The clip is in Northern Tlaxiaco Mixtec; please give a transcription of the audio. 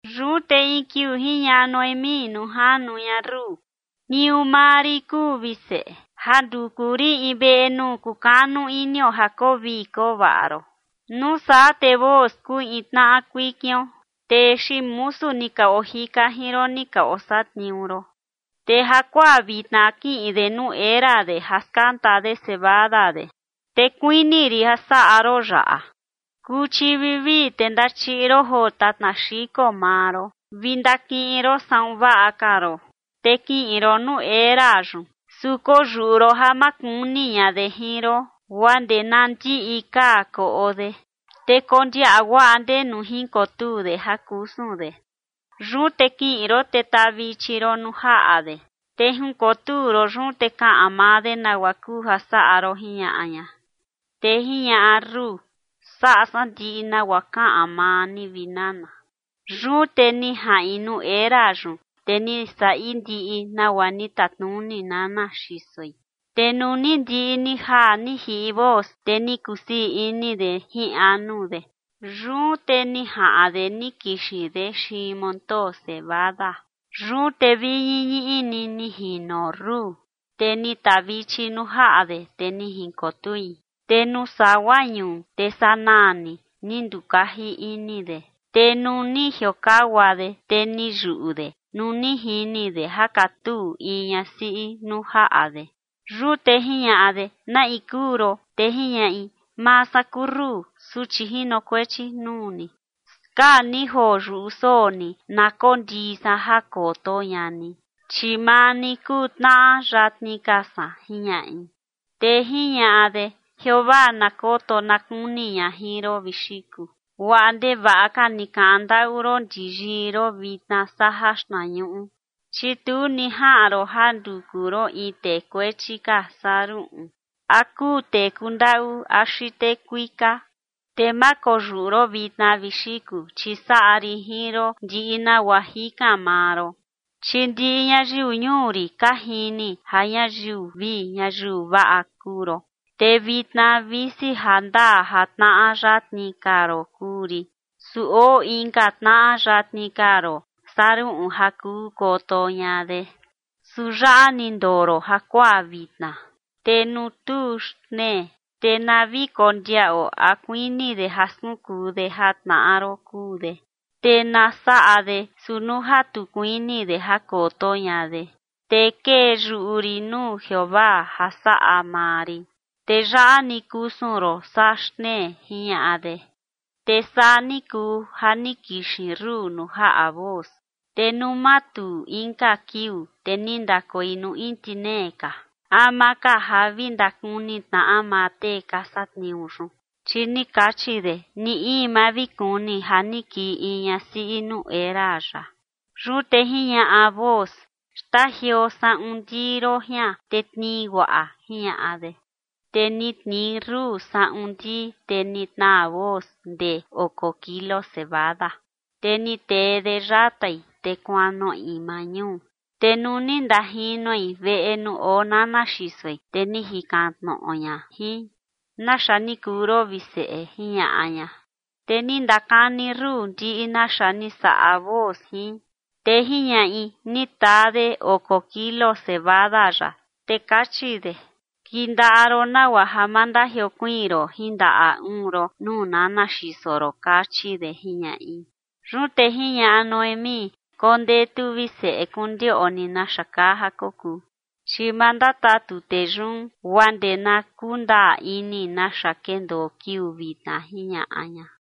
Yun te in kiuu jiñaꞌa Noemí nuu janu ña Rut: ―Tniuu maa rin kuu, vi seꞌe, ja nduku rin in veꞌe nuu kukanu inio ja koo vii koo vaꞌa ron. Nuu saa te Booz kuu in tnaꞌa kuikion, tee xiin musu ni ka ojika jin ron ni ka osatniuu ron. Te jakuaa vitna kiꞌin de nuu era de ja skanta de cebada de. Te kuini rin ja saꞌa ron yaꞌa: kuchi vivii te ndachiꞌi ron joo tatna xiko maa ron vi ndakiꞌin ron saꞌun vaꞌa ka ron, te kiꞌin ron nuu era yun, su koyuꞌu ron ja ma kuni ña de jin ron, guaa ndee na ndiꞌi kaa koꞌo de. Te kondiaꞌa guaꞌa ndenu jinkotuu de ja kusun de. Yun te kiꞌin ron te tavichi ron nuu jaꞌa de, te jinkotuu ron yun, te kaꞌan maa de nagua kuu ja saꞌa ron ―jiñaꞌa ña. Te jiñaꞌa Rut: ―Saꞌa san ndiꞌi nagua kaꞌan maa ni, vi nana. Yun te ni jaꞌin nuu era yun, te ni saꞌi ndiꞌi nagua ni tatnuni nana xisoi. Te nuu ni ndiꞌi ni jaa ni jiꞌi Booz, te ni kusii ini de jin anu de, yun te ni jaꞌan de ni kixin de xiin montoo cebada. Yun te vi ñiñiꞌi ni, ni jino Rut, te ni tavichi nuu jaꞌa de, te ni jinkotui. Te nuu sagua ñuu, te sanaa ni ndukaji ini de, te nuu ni jiokagua de, te ni yuꞌu de nuu ni jini de ja katuu in ñasiꞌi nuu jaꞌa de. Yun te jiñaꞌa de: ―¿Na in kuu ron? Te jiñaꞌi: ―Maa san kuu Rut, suchi jinokuechi nuu ni. Skaa ni joo yuꞌu soo ni na kondii san ja koto ña ni, chi maa ni kuu tnaꞌa yatni ka san ―jiñaꞌi. Te jiñaꞌa de: ―Jeovaa na koto na kuni ña jin ron, vi xiku. Guaꞌa ndevaꞌa ka ni kaꞌan ndaꞌu ron ndi yii ron vitna saa jaxtnañuꞌu, chi tu ni jaꞌan ron ja nduku ron in tee kuechi ka saa ruꞌun a kuu tee kundaꞌu axi tee kuika. Te ma koyuꞌu ron vitna, vi xiku, chi saꞌa rin jin ron ndiꞌi nagua jikan maa ron, chi ndiꞌi ñayiu ñuu rin ka jini ja ñayiu vii ñayiu vaꞌa kuu ron. Te vitna, visi jandaa ja tnaꞌa yatni ka ron kuu rin, su oo inka tnaꞌa yatni ka ron saa ruꞌun ja kuu koto ña de. Su yaꞌa ni ndoo ron jakuaa vitna, te nuu tuu xtnee, te na vi kondiaꞌo a kuini de ja skunkuu de ja tnaꞌa ron kuu de, te na saꞌa de. Su nuu ja tu kuini de ja koto ña de, te kee yuꞌu rin nuu Jeovaa ja saꞌa maa rin. Te yaꞌa ni kusun ron saa xtnee ―jiñaꞌa de. Te saa ni kuu ja ni kixin Rut nuu jaꞌa Booz. Te nuu matuu inka kiuu, te ni ndakoi nuu intinee ka, ama ka ja vi ndakuni tnaꞌa maa tee ka satniuu yun, chi ni kachi de: “Ni in ma vi kuni ja ni kii in ñasiꞌi nuu era yaꞌa”. Yun te jiñaꞌa Booz: ―Xtajioo saꞌun ndii ron jian te tnii guaꞌa ―jiñaꞌa de. Te ni tnii Rut saꞌun ndii, te ni tnaa Booz ndee oko kilo cebada, te ni tee de yatai, te kuanoꞌi maa ñuu. Te nuu ni ndajinoi veꞌe nuu oo nana xisoi, te ni jikan tnoꞌo ña jin: ―¿Naxa ni kuu ron, vi seꞌe? ―jiñaꞌa ña. Te ni ndakani Rut ndiꞌi naxa ni saꞌa Booz jin. Te jiñaꞌi: ―Ni taa de oko kilo cebada yaꞌa, te kachi de: “Kindaꞌa ron nagua ja ma ndajiokuiin ron jin ndaꞌa uun ron nuu nana xiso ron” kachi de ―jiñaꞌi. Yun te jiñaꞌa Noemí: ―Kondetu, vi seꞌe, kondioꞌni naxa kaa ja kokuu, chi ma ndatatu tee yun guaa ndee na kundaa ini naxa kendoo kiuu vitna ―jiñaꞌa ña.